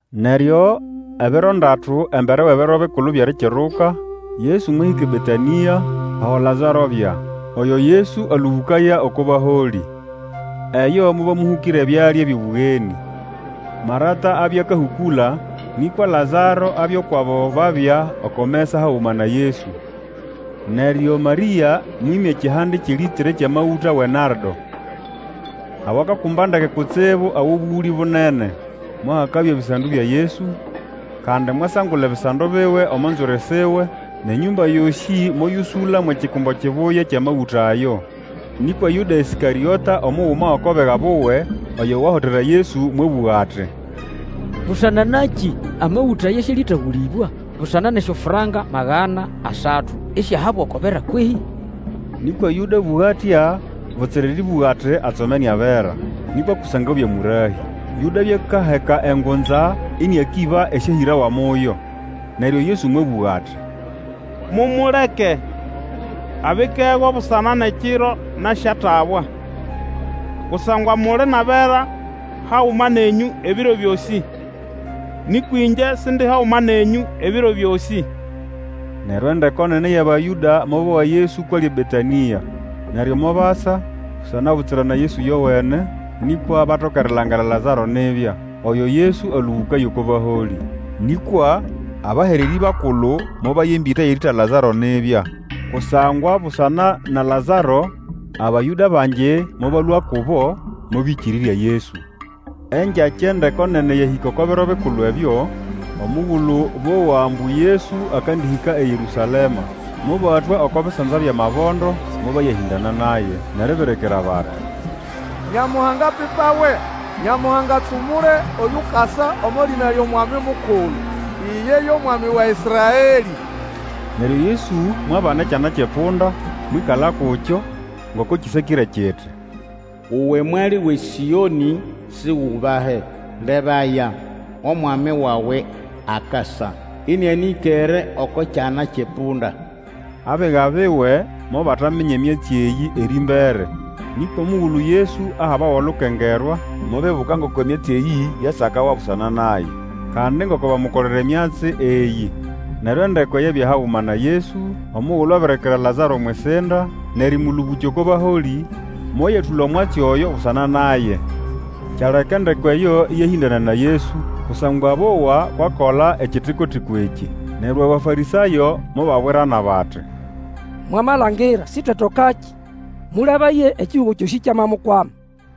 Neryo ebiro ndatu embere wʼEbiro Bikulu byʼErikiruka, Yesu mwahĩka eBetanĩa, aho Lazaro abya, oyo Yesu alũbũkaya oko baholĩ. Eyo mobamũhũkĩra ebyalya byʼobũgenĩ. Marata abya akahũkũla, nĩkwa Lazaro abya ukwʼabo babya oko mesa haguma na Yesu. Neryo Marĩa mwĩmya ekihande kyʼelĩtre kyʼamagũta wʼenardo awakakumba ndeke kutsibu awʼobũgũlĩ bunene, mwahakabya ebisando bya Yesu, kandi mwasangula ebisando biwe omo nzwiri siwe, nʼenyũmba yosĩ moyũsũla mwʼekikumbo kibuya kyʼamagũta ayo. Nĩkwa Yũda Ĩskarĩota, omuguma gʼoko biga buwe, oyo wahotera Yesu, mwabũga ati, Busana nakĩ amagũta aya sialitagũlĩbwa busana nʼesyofranka magana asatu, isyahabwa oko bera kwehĩ? Nĩkwa Yũda abũga atya butsira erĩbũga ati atsomene abera, nĩkwa kusangwa abya mũrahĩ. Yũda abya akaheka engunza ĩnĩakĩba esyahĩrawa muyo. Neryo Yesu mwabũga ati, Mumuleke! Abikego busana nʼekiro nasyatabwa! Kusangwa muli nʼabera haguma nenyũ ebiro byosĩ, nĩkwa ĩngye Sindi haguma nenyũ ebiro byosĩ. Neryo endeko nene yʼAbayũda mobowa Yesu kwʼali eBetanĩa. Neryo mobasa, butsira busana na Yesu ĩyowene, nĩkwa batoke erilangira Lazaro nibya, oyo Yesu alũbũkaya oko baholĩ. Nĩkwa abahererĩ bakulu mobaya embĩta yʼerĩĩta Lazaro nibya. Kusangwa busana na Lazaro Abayũda bangi mobalũa kubo mobĩkĩrĩrya Yesu. Engyakya endeko nene eyahĩka oko Biro Bikulu ebyo, omugulu bowa ambu Yesu akandĩhĩka eYerũsalema, Mobatwa oko bisanza byʼamabondo, mobayahĩndana naye, nʼeribirikira bati, Nyamuhanga apipawe! Nyamuhanga atsumule oyukasa omo lĩna lyʼOmwami Mukulu, iye yo Mwami wa Ĩsraelĩ. Neryo Yesu mwabana ekyana kyʼepunda, mwĩkala kukyo, ngoko kĩsakĩre kiti, Uwe Mwali wʼeSĩonĩ, Sigubahe! Lebaya, omwami wawe akasa, Ĩnĩanĩkere oko kyana kyʼepunda. Abiga biwe mobataminya emyatsi eyĩ erĩmbere, nĩkwa omugulu Yesu ahabawa olukengerwa, mobibuka ngoko emyatsi eyĩ yasakawa busana naye, kandi ngoko bamukolera emyatsi eyĩ. Neryo endeko eyabya haguma na Yesu omugulu abirikira Lazaro omwʼisinda nʼerĩmũlũbũkya oko baholĩ, moyatũla omwatsi oyo busana naye. Kyaleka endeko eyo ĩyahĩndana na Yesu, kusangwa bowa kwʼakola ekitiko-tiko ekĩ. Neryo Abafarĩsayo mobabwirana bati, Mwamalangira, sitwetatokakĩ! Mũlebaye, ekihugo kyosĩ kyamamukwama!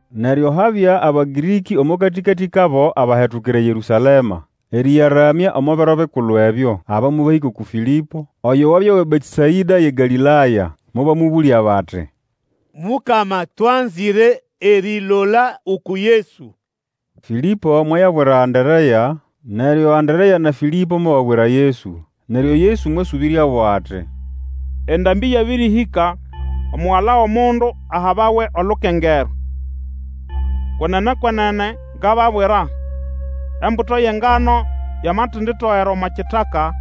Neryo habya Abagĩrĩkĩ omo katĩkatĩ kabo abahetukira eYerũsalema erĩyaramya omo Biro Bikulu ebyo. Aba mobahĩka uku Fĩlĩpo, oyo wabya wʼeBetesaĩda yʼeGalĩlaya. Mobamũbũlya bati, Mukama, twanzĩre erilola uku Yesu. Fĩlĩpo mwayabwira Anderea, neryo Anderea na Fĩlĩpo mobabwira Yesu. Neryo Yesu mwasũbĩryabo ati, Endambĩ yabĩrĩhĩka, Omugala wʼOmundu ahabawe olukengerwa. Kwenene, kwenene ngababwira, embuto yʼengano yamatenditogera omo kitaka,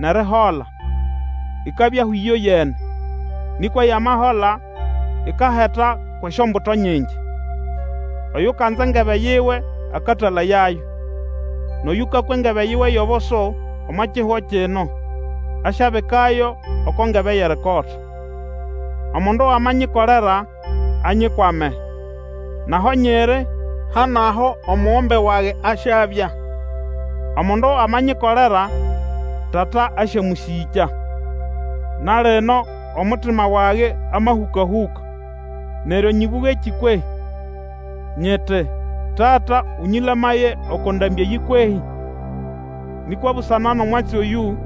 nʼerihola, ikabyaho ĩyoyene; nĩkwa yamahola, ikaheta kwʼesyombuto nyingi. Oyukanza engebe yiwe akatalayayo; nʼoyũkakwa engebe yiwe yʼobusu omo kihugo kino, asyabikayo oko ngebe yʼerikota. Omundu amanyikolera, anyikwame, nʼaho nyiri ha nʼaho omugombe wage asyabya. Omundu amanyikolera, Tata asyamũsĩkya. Na lino omutima wage amahũkahũka; neryo nyĩbũgekĩ kwehĩ? Nyiti, Tata ũnyĩlamaye oko ndambĩ eyĩ kwehĩ? Nĩkwa busana nʼomwatsi oyũ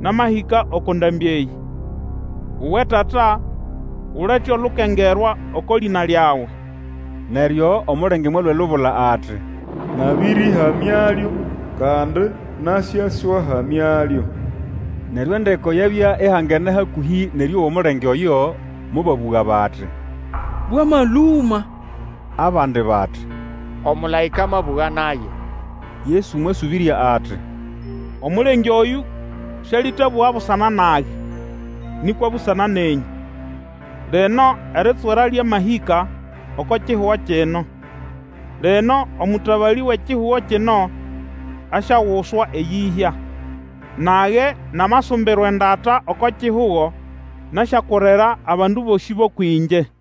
namahĩka oko ndambĩ eyĩ. Uwe Tata, ulete olukengerwa oko lĩna lyawe! Neryo omulenge mwalũa elubula ati, Nabĩrĩhamyalyo, kandi nasyaswahamyalyo. Neryo endeko eyabya ihangene hakũhĩ nʼerĩowa omulenge oyo, mobabũga bati, Bwamalũma! Abandi bati, Omũlaĩka amabũga naye! Yesu mwasũbĩrya, ati, Omulenge oyũ Sĩalĩtabũga busana nage, nĩkwa busana nenyũ. Lino eritswera lyamahĩka oko kihugo kino; lino omũtabalĩ wʼekihugo kino asyaguswa eyĩhya. Nage, namasumbirwa endata oko kihugo, nasyakurira abandu bosĩ bʼũkwʼĩngye.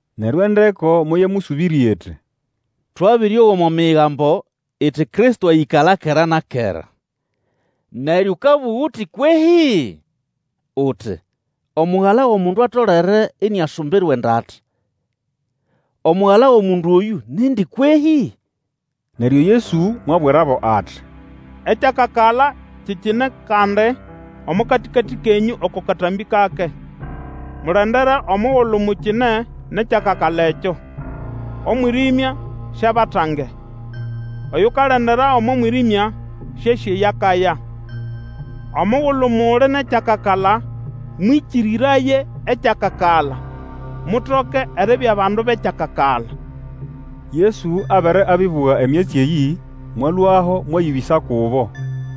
Neryo endeko moyamũsũbĩrya iti, Twabĩrĩowa omo Migambo iti Kristo ayĩkala kera na kera. Neryo ũkabũga uti kwehĩ? Uti, Omugala wʼOmundu atolere iniasumbirwa endata. Omugala wʼOmundu oyũ nindi kwehĩ? Neryo Yesu mwabwirabo ati, Ekyakakala kikine kandi omo katĩkatĩ kenyũ oko katambĩ kake. Mulendere omugulu mukine nʼekyakakala ekyo, omwĩrĩmya siabatange. Oyukalendera omo mwĩrĩmya sĩasĩ eyo akaya. Omugulu muli nʼekyakakala mwĩkĩrĩraye ekyakakala, mutoke eribya bandu bʼekyakakala. Erĩtendĩkĩrĩrya lyʼAbayũda Yesu abere abĩbũga emyatsi eyĩ, mwalũaho mwayĩbĩsa kubo.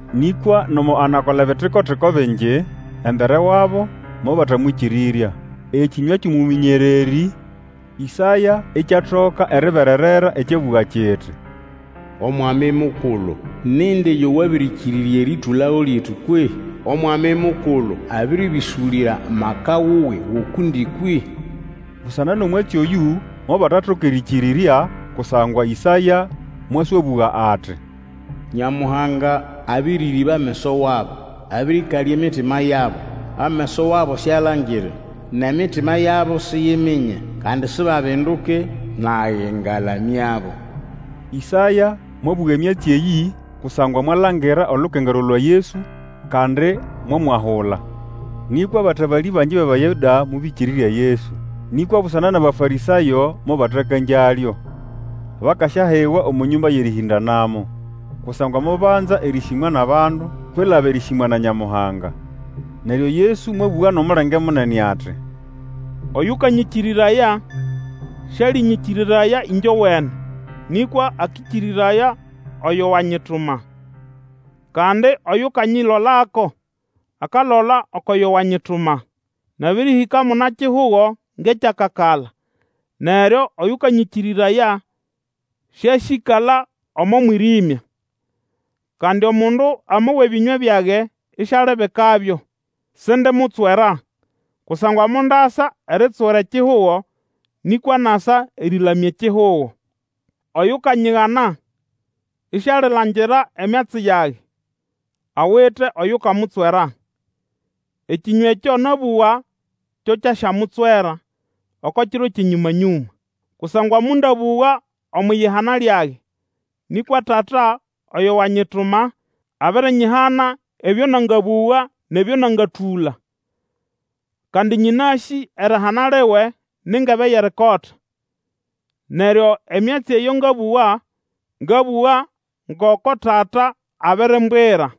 Nĩkwa nomo anakola ebitiko-tiko bingi embere wabo, mobatamwĩkĩrĩrya. Ekĩnywa kyʼomũmĩnyererĩ Ĩsaya ikyatoka eribererera ekyabũga kiti, Omwami Mukulu, nindi yo wabĩrĩkĩrĩrya erĩtũlago lyetu kwehĩ? Omwami Mukulu abirĩbĩsũlĩra amaka wuwe ukundi kwehĩ? Busana nʼomwatsi oyũ, mobatatoka erĩkĩrĩrya, kusangwa Ĩsaya mwaswabũga ati, Nyamuhanga abĩrĩrĩba ameso wabo, Abĩrĩkalya emitima yabo, Ameso wabo syalangire, Nʼemitima yabo siyiminye, Kandi sibabinduke, Nage, ngalamyabo. Ĩsaya mwabũga emyatsi eyĩ kusangwa mwalangira olukengerwa lwa Yesu, kandi mwamwahula. Nĩkwa abatabalĩ bangi bʼAbayũda mobĩkĩrĩrya Yesu; nĩkwa busana nʼAbafarĩsayo mobatakangyalyo, bakasyahigwa omo nyũmba yʼerĩhĩndanamo. Kusangwa mobanza erĩsĩmwa nʼabandu kwilaba erĩsĩmwa na Nyamuhanga. Neryo Yesu mwabũga nʼomulenge munene ati, Oyũkanyĩkĩrĩraya, sĩalĩnyĩkĩrĩraya ĩngyowene, nĩkwa akĩkĩrĩraya oyo wanyituma. Kandi oyukanyilolako, akalola ukwʼoyo wanyituma, Nabĩrĩhĩka muna-kihugo ngʼekyakakala, neryo oyũkanyĩkĩrĩraya sĩasyĩkala omo mwĩrĩmya. Kandi omundu amowa ebĩnywa byage, isialibikabyo, sindimutswera, kusangwa mondasa eritswera ekihugo, nĩkwa nasa erĩlamya ekihugo. Oyukanyigana, isialilangira emyatsi yage, awite oyukamutswera; ekĩnywa ekyo nabũga kyo kyasyamutswera oko kiro kyʼenyũma-nyũma! Kusangwa mondabũga omwʼiyihana lyage, nĩkwa Tata oyo wanyituma abirinyihana ebyo nangabũga nʼebyo nangatũla. Kandi nyĩnasĩ erihana liwe ni ngebe yʼerikota. Neryo emyatsi eyo ngabũga, ngabũga ngoko Tata abirimbwira.